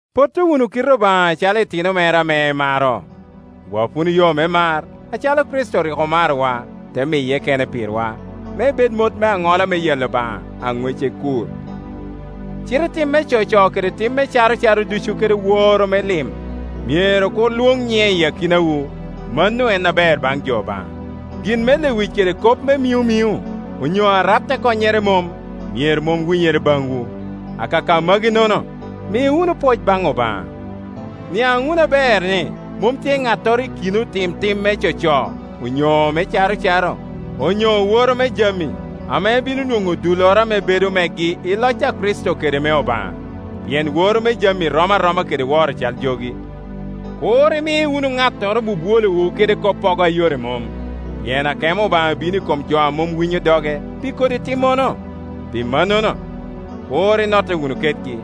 Potto wunu kite Obaŋa acalo itino mere ame emaro. Wap wunu yo me mar, acalo Kricito rik omarowa, te miye kene pirwa, me ebed mot me aŋola me yalo Obaŋa, a ŋwece kur. Cite tim me coco kede tim me caro caro ducu kede woro me lim myero kur lwoŋ nyiŋe i akinawu, mano en aber baŋ jo Obaŋa. Gin me lewic kede kop me miŋomiŋo, onyo arat a konnyere mom, myero mom winyere baŋwu. Akaka magi-nono, mi wunu pwoc baŋ Obaŋa. Niaŋ wunu aber ni mom tye ŋattoro i kin otim tim me coco, onyo me carocaro, onyo oworo me jami, ame bino nwoŋo dulloro ame bedo megi i loc a Kricito kede me Obaŋa, pien woro me jami rom aroma kede woro cal jogi. Kur imi wunu ŋattoro bwobwolowu kede koppogo a yore mom, pien akemo Obaŋa bino i kom jo a mom winyo doge pi kodi timmono. Pi mannono, kur inotte wunu kedgi.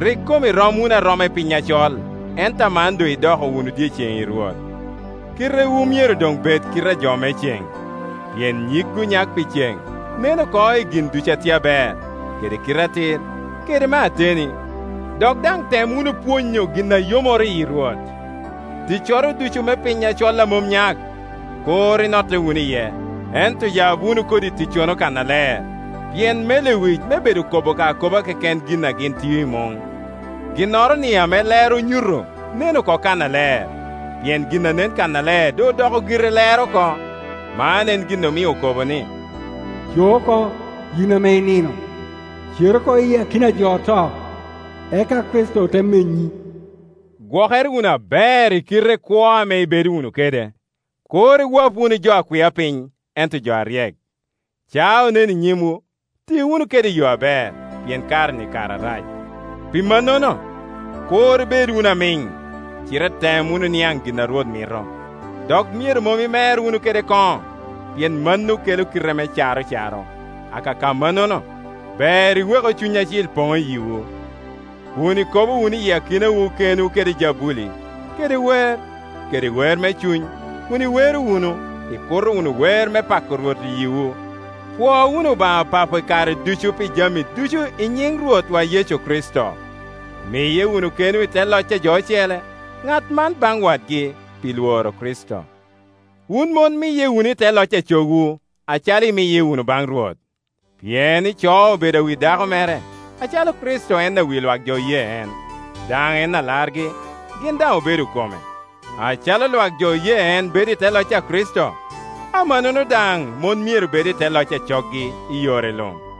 Rik kom irom wunu aroma i piny acol, ento aman doŋ idoko wunu dyeceŋ i Rwot; kitewu myero doŋ bed kite a jo me ceŋ. Pien nyig onyak pi ceŋ nen oko i gin ducu a tye aber, kede atir, kede me ateni. Dok daŋ tem wunu pwonyo gin a yomoro yi Rwot. Ticcoro ducu me piny acol a mom nyak, kur inotte wunu iye, ento yab wunu kodi ticcono kannaler. Pien me lewic me bedo kobo ka akoba keken gin a gin tio i muŋ. Ginnoro-ni ame lero onyuto nen oko kannaler; pien gin a nen kannaler doŋ odoko gire lero oko. Man en gin omio okobo ni, “Co oko, yin ame inino, cer oko iyi akina a jo oto, eka Kricito te menyi.” Gwokere wunu aber i kite kwo ame ibedo wunu kede; kur iwap wunu jo a kwia piny, ento jo aryek. Caa onen i nyimwu ti wunu kede i yo aber, pien kare-ni kare arac. Pi mannono, kur ibed wunu amiŋ, cite tem wunu niaŋ gin a Rwot mito. Dok myero mom imer wunu kede koŋo, pien mano kelo kite me caro caro. Akaka mannono, ber iweku Cuny Acil Poŋ i yiwu, kun ikobo wunu i akinawu kenwu kede jabuli, kede wer, kede wer me cuny, kun iwero wunu, ikuto wunu wer me pako Rwot i yiwu. Pwo wunu Obaŋa Papo i kare ducu pi jami ducu i nyiŋ Rwotwa Yecu Kricito. Miye wunu kenwu i te loc a jo ocele, ŋat man baŋ wadgi, pi lworo Kricito. Pet. 3.1Wun mon miye wunu i te loc a cogwu, acalo imiye wunu baŋ Rwot, pien ico obedo awi dako mere, acalo Kricito en awi lwak jo oye en, daŋ en alargi, gin daŋ obedo kome. Acalo lwak jo oye en bedo i te loc a Kricito, amannono daŋ mon myero bed i te loc a coggi i yore luŋ. Pet.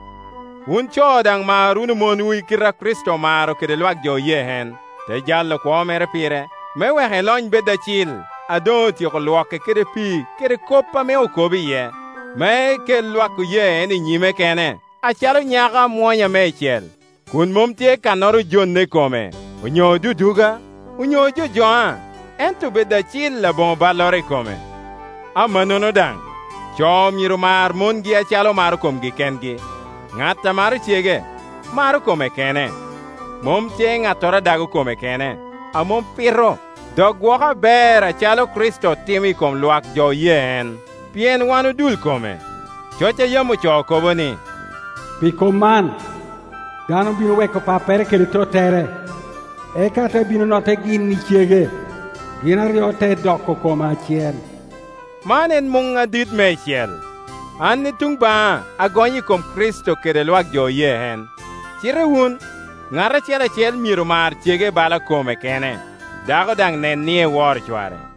3.7Wun co daŋ mar wunu monwu i kite a Kricito omaro kede lwak jo oye en, te jalo kwo mere pire, me wek elony bed acil, a doŋ otyeko lwoke kede pii kede kop ame okobo iye, me ekel lwak oye en i nyime kene acalo nyako amwonya meicel, kun mom tye kannoro ojonne i kome, onyo oduduga, onyo ojojoŋa, ento bed acil aboŋo balloro i kome. Amannono daŋ, co myero mar mongi acalo omaro komgi kengi. Ŋat a maro cege, maro kome kene. Mom tye ŋattoro a dago kome kene, a mom pito dok gwoko aber acalo Kricito timo timo i kom lwak jo oye en, pien wan odul kome. Coc a yam ocoo kobo ni, “Pi kop man, dano bino weko pappere kede tottere, eka te bino notte gin i cege, gin aryo te doko kom acel.” Man en muŋ adit meicel. An i tuŋ baŋa agonyo i kom Kricito kede lwak jo oye en. Cite wun, ŋat acel acel myero mar cege bala kome kene, dako daŋ nen ni eworo cware.